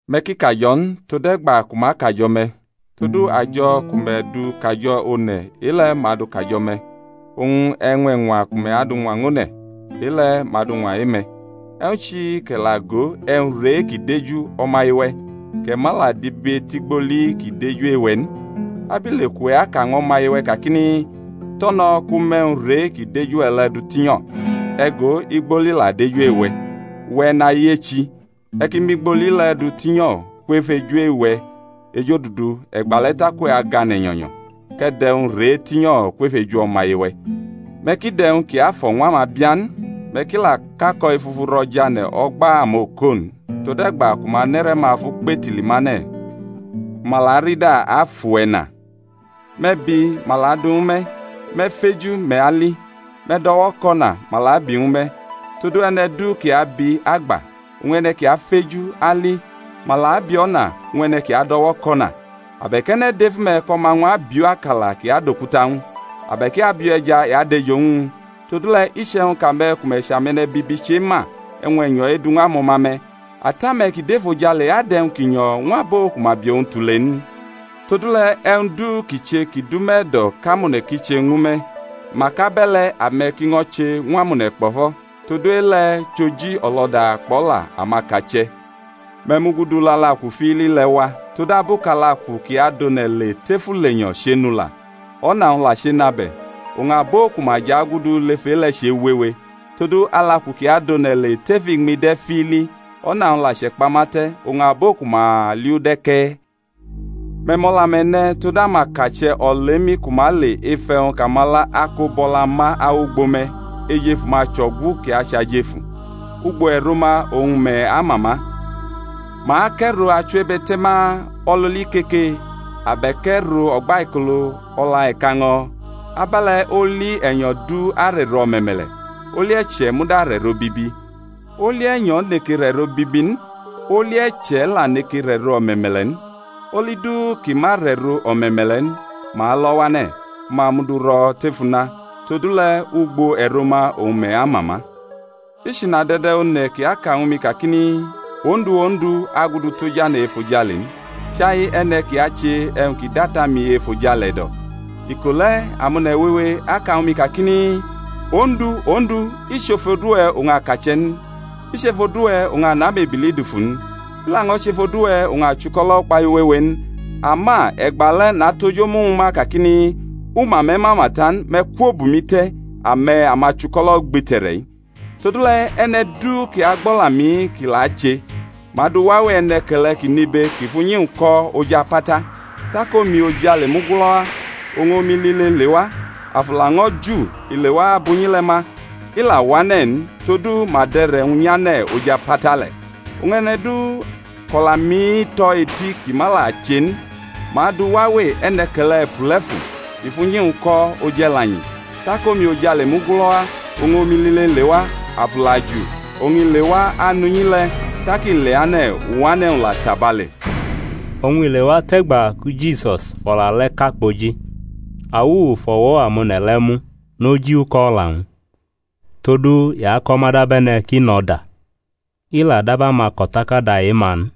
Me̩ ki kajo̩ n, tode̩gba ku ma kajo̩ me̩. Todu ajo̩ ku me̩ du kajo̩ one̩, e-le̩ ma adʼu kajo̩ me̩, oñ e̩ñwa ku me̩ du ñwa e-one̩, e-le̩ ma adu ñwa e-me̩. E̩wñ chi kʼe̩ la go e̩wñ re kʼi dʼeju o̩maye-we̩, kʼe̩ ma la dibetʼigboli kʼi dʼeju e-we̩ n? Abile kʼuwe̩ aka ñw o̩maye-we̩ kakini, To̩no̩ kʼu mʼe̩wñ re kʼi dʼeju-we̩ le̩ du tinyo̩? E̩ go, igboli la dʼeju e-we̩. Uwe̩ e̩nayechi, e̩ ki mʼigboli le̩ du tinyo̩ kwef eju e-we̩ ejodudu, e̩gbale̩ tak uwe̩ gane̩ nyo̩nyo̩ kʼe̩ dʼe̩wñ re tinyo̩ kwef eju o̩maye-we̩. Me̩ ki dʼe̩wñ kiafo̩ ñw amabia n; me̩ ki la kʼako̩ efufu ro̩ jʼane̩ o̩gba amoko n, tode̩gba ku ma nʼe̩re̩-ma fʼu kpetili mane̩, ku ma la arida afʼuwe̩ na. Me̩ bi, ma la adu ñwu me̩; me̩ feju, me̩ ali; me̩ dʼo̩wo̩ kʼo̩na, ma la abi ñwu me̩. Todu e̩ne̩ du kʼi abi, agba; oñ e̩ne̩ kʼi afeju, ali; ma la abi o̩na ñw e̩ne̩ kʼi adʼo̩wo̩ kʼo̩na. Abe̩k e̩ne̩ dʼef ume̩ kʼo̩ma-wñ abiʼu akala, kʼi adʼokuta ñw u? Abe̩k i biʼu e̩ja, i adʼejo ñw u? Todule̩ iche̩wñ kʼame̩ ku me̩ chʼame̩ne̩bibi chema e̩wñ e̩nyo̩ edu ñw amo̩ma-me̩, Ata-me̩ kʼi dʼefojale adʼe̩wñ ki nyo̩ ñw abo ku ma bi owñ tule n? Todule̩, e̩wñ du kʼi che kʼi dʼume̩ e̩do̩ kʼamone̩ ki che ñwu me̩, mak abe̩le̩ ame̩ ki ño̩ che ñw amone̩ kpo̩fo̩: todu e-le̩ chʼoji o̩lo̩da kpʼo̩la amakache̩. Me̩ mugudu lʼalaku fiili le̩ wa; todabu kʼalaku kʼi adʼone̩ le tef ulenyo̩ ehenʼula, o̩na-wñ la chenʼabe̩, oñ abo ku ma jʼagudu lef e-le̩ chewewe. Todu, alaku kʼi adʼone̩ le tef iñmi de̩ fiili, o̩na-wñ la chʼekpamate̩, oñ abo ku ma liʼu de̩ ke̩. Me̩ mʼo̩la-me̩ ne̩ tod amakache̩ olemi ku ma le ef e̩wñ kʼamala ako bʼo̩la ma awʼugbo me̩, ejefu-ma chʼo̩gu kʼi chʼajefu. Ugbo e̩ro-ma oñ me̩ ama ma. Ma kʼe̩ro achiwebe̩te̩ma o̩lʼoli ikeke? abe̩k e̩ro o̩gbaikolo o̩la e̩kaño̩? Abe̩le̩ oli e̩nyo̩ du arʼe̩ro o̩me̩me̩le̩, oli e̩che̩ muda arʼe̩ro bibi. Oli e̩nyo̩ neke rʼe̩ro bibi n, oli e̩che̩ la neke rʼe̩ro o̩me̩me̩le̩ n. Oli du kʼi ma rʼe̩ro o̩me̩me̩le̩ n ma alʼo̩ wane̩, ku ma mʼu du ro̩ tef una. Todule̩ ugbo e̩ro-ma oñ me̩ ama ma. I chʼinade̩de̩ one̩ kʼi aka ñwu mi kakini, Ondu, Ondu, agudu tʼojane̩ efojale n, chai e̩ne̩ kʼi ache e̩wñ kʼi dʼAta-mi e-efojale e̩do̩. Iko le̩ amone̩ wewe aka ñwu mi kakini, Ondu, Ondu, i chʼef odu-we̩ oñ a kache̩ n? I chʼef odu-we̩ oñ a nʼamebili dufu n? I laño̩ chʼef odu-we̩ oñ a chʼuko̩lo̩ ukpahiu wewe n? Ama e̩gba le̩ natʼoj omu ñwu ma kakini, U ma me̩ mama ta n: me̩ kwo bʼumi te̩, ame̩ amachuko̩lo̩ ugbite̩re̩-i. Todule̩, e̩ne̩ du kʼi agbʼo̩la-mi-i kʼi la ache, ma adʼu wawe e̩ne̩ke̩le̩ kʼi nʼibe, kʼi fʼunyi-wñ ko̩ oj apata; tak omi ojale mugulo̩ wa, oñ omi lile lewa, afu laño̩ ju i lewa abʼunyi le̩ ma, i la wane̩ n; todu ma dʼe̩re̩-wñ nyʼane̩ oj apata le̩. Oñ e̩ne̩ du kʼo̩la-mi-i tʼo̩ eti kʼi ma la che n, ma adʼu wawe e̩ne̩ke̩le̩ e̩fule̩fu kʼi fʼunyi-wñ ko̩ oj e̩lanyi; tak omi ojale mugulo̩ wa, oñ omi lile lewa, afu la ju, oñ i lewa anʼunyi le̩, tak i leane̩, uwane̩-wñ la tabale! Oñ i lewa tʼe̩gba ki Jisus fʼo̩la le̩ ka kpoji, awuwu fʼo̩wo̩ amone̩ le̩ mu noj uko̩ o̩la-wñ: todu i ako̩ ma dabe̩ne̩ kʼi nʼo̩da, i la dab amako̩takada e-ma n.